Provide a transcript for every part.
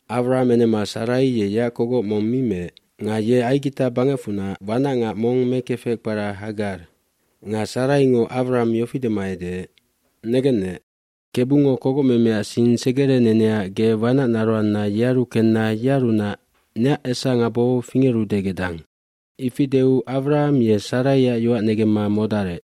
Awram enema Sarai ye yeac kogoc mong mi meec. Nga ye Aigita bangecfunac wanacngac mong mekefec kpara Hagar. aNga Saraingo Awram yofi dema edeec, “Negennec, Kebungo kogocmemeac sing segereneneac ge wanacnaroanna yearu kenna yearunac neac esangabo fingerude gedang.” Ifi deu Awram ye Saraiac yoac negemma modarec.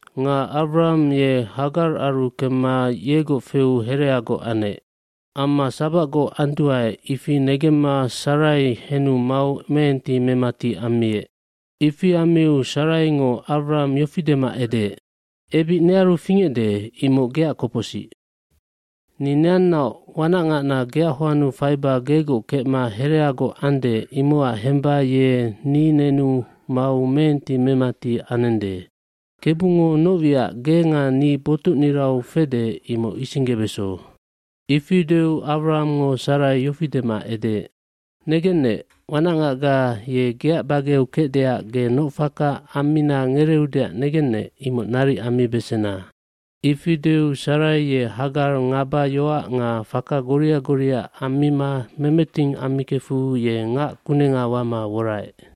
bNga Awram ye Hagararu kemma yegoc feu hereagoc anec. Amma sabacgoc anduae ifi negemma Sarai henu mau meenti memati ammiec. cIfi ammiu Saraingo Awram yofi dema edeec, “Ebic nearu fingecde imoc geac kopocsic. Ni neannaoc wanacngacna geac hoannu faiba gegoc kecma hereagoc ande imocac hemba ye ni nenu mau meenti memati anende. Kebungo noc wiac ge nga ni botucnirau fede imoc isinggebeso.” Ifi deu Awramngo Sarai yofi dema edeec, “Negennec, wanacngacga ye geac bageu kecdeac ge noc faka ammina ngereeudeac negennec imoc naric ammibesena.” Ifi deu Sarai ye Hagar ngaba yoac nga faka goria goria ammima memeting ammikefu ye ngac kunenga wama woraec.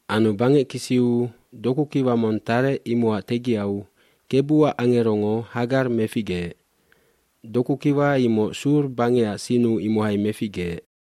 dAnu bangec kisiu dokukiwa mong tarec imocac tegiau Kebuac angerongo Hagar meficgeec. Dokukiwa imoc Sur bangeac sinnu imohai meficgeec.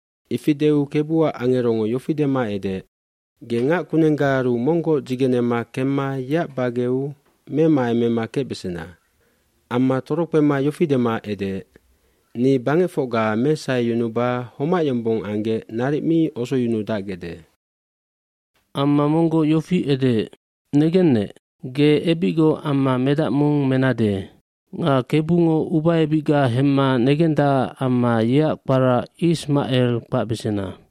Ifi deu Kebuac angerongo yofi dema edeec, “Ge ngac kunenggaaru monggoc dzigenema kemma yeac bageu memaemema kecbesena.” eAmma torokpema yofi dema edeec, “Ni bangecfocga mesaheyunuba homac yombong anggec naric mi osoyunudacbesandae.” Amma monggoc yofi edeec, “Negennec, ge ebicgoc amma medac mong menade. Nga Kebungo ubaebicga hemma negendacac amma yeac kpara Ismacelf kpacbesena.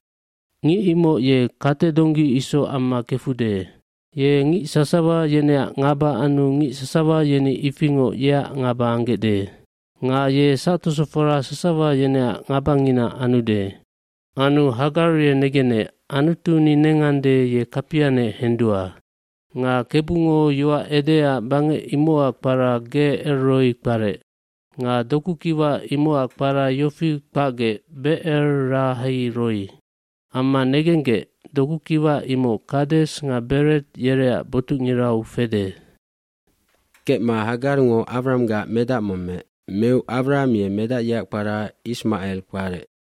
Ngic imoc ye katedonggi isoc amma kefude. Ye ngic sasawa yeneac ngaba anu ngic sasawa yeni ifingoc yeac ngaba anggecde. Nga ye sactosofora sasawa yeneac ngabangina ambesande.” Anu Hagar ye negenec Anutu ni nengande ye kapianec hendua. Nga Kebungo yoac edeecac bangec imocac kpara Ge El Roig kparec. iNga doku kiwa imocac kpara yofi kpacgec Becer Lahai Roih Amma negenggec, dokukiwa imoc Kades nga Bered yereac botucngirau fede. jKecma Hagarngo Awranggac medac mong meec. Meu Awram ye medac yeac kpara Ismacel kparec.